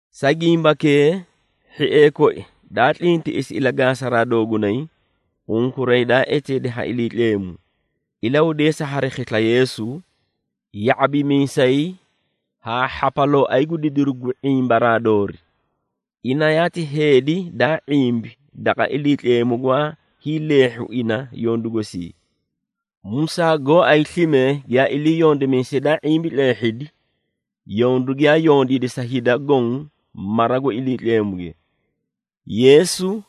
Sa gimbakee, hhiee koi daa tlintiꞌisi ilagaasaraa doogunay, unkuray daa eteedi ha Iliitleemu, ilahudeesa hari khisla Yeesu, ya⁄abimiisay haa hhapalooay gu didiru gu ⁄imbaraa doori. Ina yaati heedi daa ⁄imbi daqa Iliitleemu gwaa hiileehhu ina yondu gosii, Musaa gooay slime giyaa ilii yondimiisay daa ⁄imbi tleehhidi yondu giyaa yondiidi sa hida goõ mara gu Iliitleemuge. Yeesu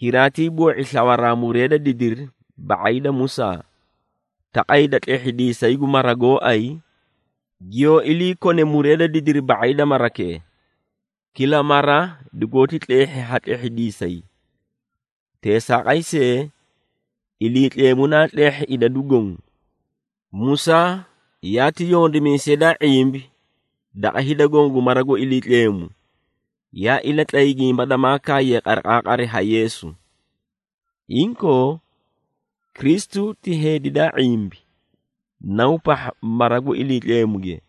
hiraatiiboo⁄i slawa muree da didiri ba⁄ay da Musaa, taqay da tlehhidiisay gu mara gooay giyoó ilii kone muree da didiri ba⁄ay marakee. Kila mara dugoóti tleehhi ha tlehhidiisay. Teesaaqay see, Iliitleemu naa tleehhi idadu goõ. Musaa yaati yondimiisay daa ⁄imbi daqa hida goõ gu mara gu Iliitleemu, yaa ilatlay gimba damaa kaaye qariqaaqari ha Yeesu. Inkoo, Kristu ti heedi daa ⁄imbi, Naw pahha mara gu Iliitleemuge.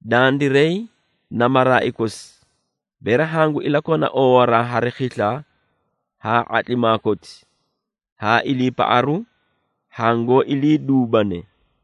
Dandiray na maraai kosi, bere hangu ilakona oowaraa hari khisla haa ⁄atlimaa koti, haa iliipaꞌaru hangoó iliiduubane.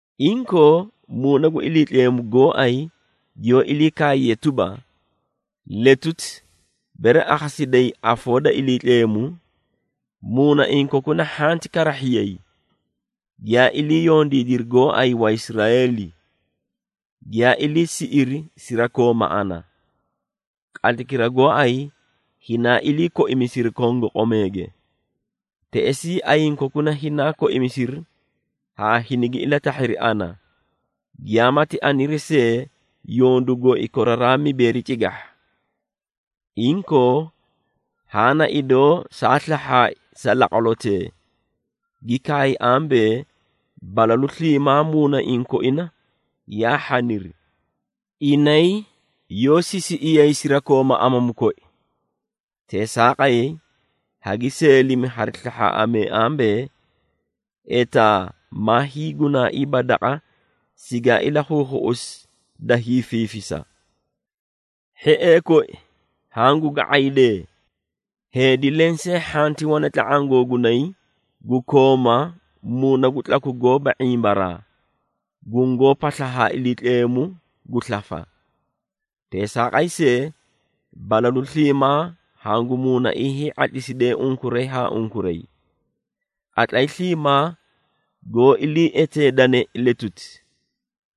Inkoo, Muuna gu Iliitleemu gooay giyoó ilii kaaye tuba, “Letuti, bere akhasidayi afoo da Iliitleemu, muunaiĩ kokuna hhanti karahhiyay, giyaa ilii yondiidiri gooay Waisraeeli, giyaa ilii siꞌiri sirakooma ana, qatlaykira gooay hinaa ilii koimisiri kongoqomeege. Teꞌesii ayiĩ kokuna hinaa koimisiri haa hinigi ilatahhiri ana, giyaamati aniri see yondu gooi koraraa mibeeri cigahha. Inkoo, haã na idoo saa slahhaai sa laqwalotee, gi kaay ambee, ‘Balalu sliimaa muunaiĩ koina yaa hhaniri. Inay yoó sisiꞌiyay sirakooma amamu koi.’ Teesaaqay, hagi seelimi hari slahhaaꞌamee ambee, ‘Etaa maa hiigunaaiiba daqa sigaa ilakhuukhuꞌusi da hiifiifisa!’” Hhiee koi, hangu ga⁄aydee! Heedi lensee hhanti wane tla⁄aã googunay gu kooma muuna gu tlaku goóba ⁄imbaraa, gungoó pasla haa Iliitleemu gu slafa. Teesaaqay see, balalu sliimaa hangu muunaiĩ hii⁄atlimisidee unkuray haa unkuray. Qatlay sliimaa goó ilii eteedane “letuti,”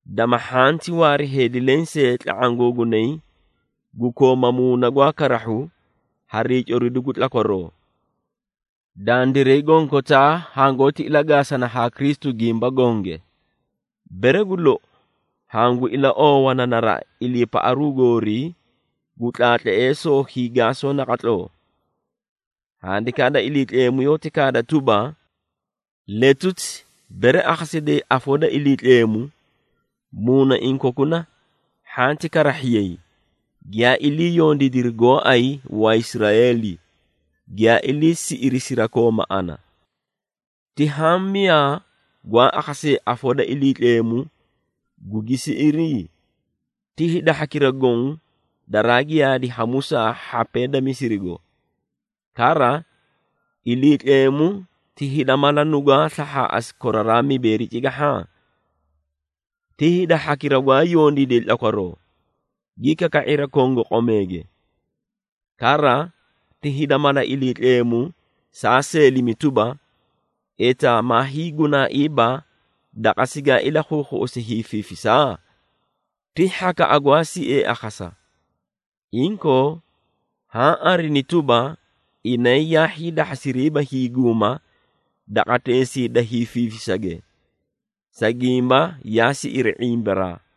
dama hhanti waari heedi lensee tla⁄aã googunay gu kooma muuna gwaa karahhu hari hiicoridu gu tlakwaroo. Dandiray gonkotaa hangoóti ilagaasana haa Kristu gimba gonge, bere gu lou hangu ilaoowana naraꞌa iliipaꞌaru goorii gu tlaatleesoo hiigaasoo naqatloo. Handikaa da Iliitleemu yoóti kaada tuba, “Letuti, bere akhasidayi afoo da Iliitleemu, muunaiĩ kokuna hhanti karahhiyay, giyaa ilii yondiidiri gooay Waisraeeli, giyaa ilii siꞌiri sirakooma ana.” Ti haã miyaa gwaa akhasee afoo da Iliitleemu, gugi siꞌiri? Ti hida hhakira goõ daraa giyaadi ha Musaa hhapee da Misirigo. Kara, Iliitleemu ti hida mala nugwaa slahhaaꞌasi koraraa mibeeri cigahha? Ti hida hhakira gwaa yondiide tlakwaroo, gi kaka⁄iri kongoqomeege. Kara, ti hida mala Iliitleemu saa seelimi tuba, “Etaa maa hiigunaaiiba daqa sigaa ilakhuukhuꞌusi da hiifiifisa?” Ti hhakaꞌa gwaa siee akhasa. Inkoo, haã arini tuba, inay yaa hiidahhasiriiba hiiguuma daqateesii da hiifiifisage, sa gimba yaa siꞌiri ⁄imbaraa.